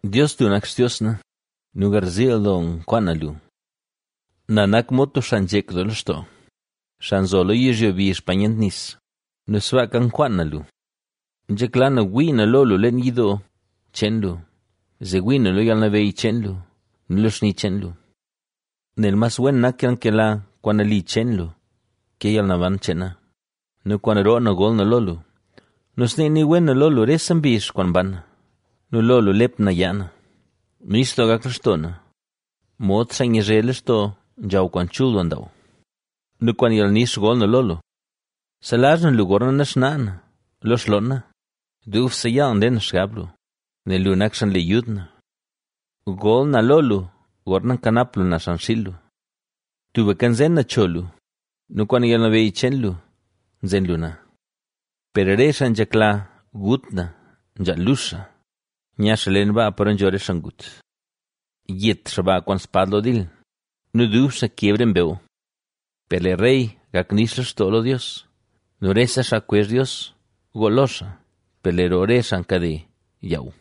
Dios, lu nak Xtios na nu garziil doo nkwaan na lu. Na nak mod tub xaa nzhek doo lextoo, xaa nzo lo yizhyo bizh pa nyent nis nu sbaaka nkwaan na lu. Nzhekla na wii na lo lu leen yidoo cheen lu, zee wii na lo yalnabeyy cheen lu nu lo xni cheen lu. Nel mas wen nak yalnkela kwaan nali cheen lu ke yalnaban cheen na nu kwaan roo na gol na lo lu. Nu snee nii wen na lo lu rese mbizh kwaan mban na nu lo lu lep na yaa na. Nix doo gak lextoo na, mod xaa nyazhe lextoo nzhaw kwaan chul doo ndaaw nu kwaan yalnix gol na lo lu. Selazh na lu gorna naxnaa na lo xloon na, dubse yaal nle na xgab lu, nel lu nak xaa nle yud na. Gol na lo lu, gorna kanap lu na xan xiil lu. Tubka nzen na cho lu nu kwaan yalnabeyy cheen lu nzen lu na. Per re xaa nzhekla gut na nzhaal lux xaa, nya xaa leen baa paro nzho re xaa ngut. Yet xaa ba kwaan spad lo dil, nu dub xaa keb re mbew. Per lee rey gak nix lextoo lo Dios nu rese xaa kwezh Dios gool lo xaa, per lee roo re xaa nkade yaaw.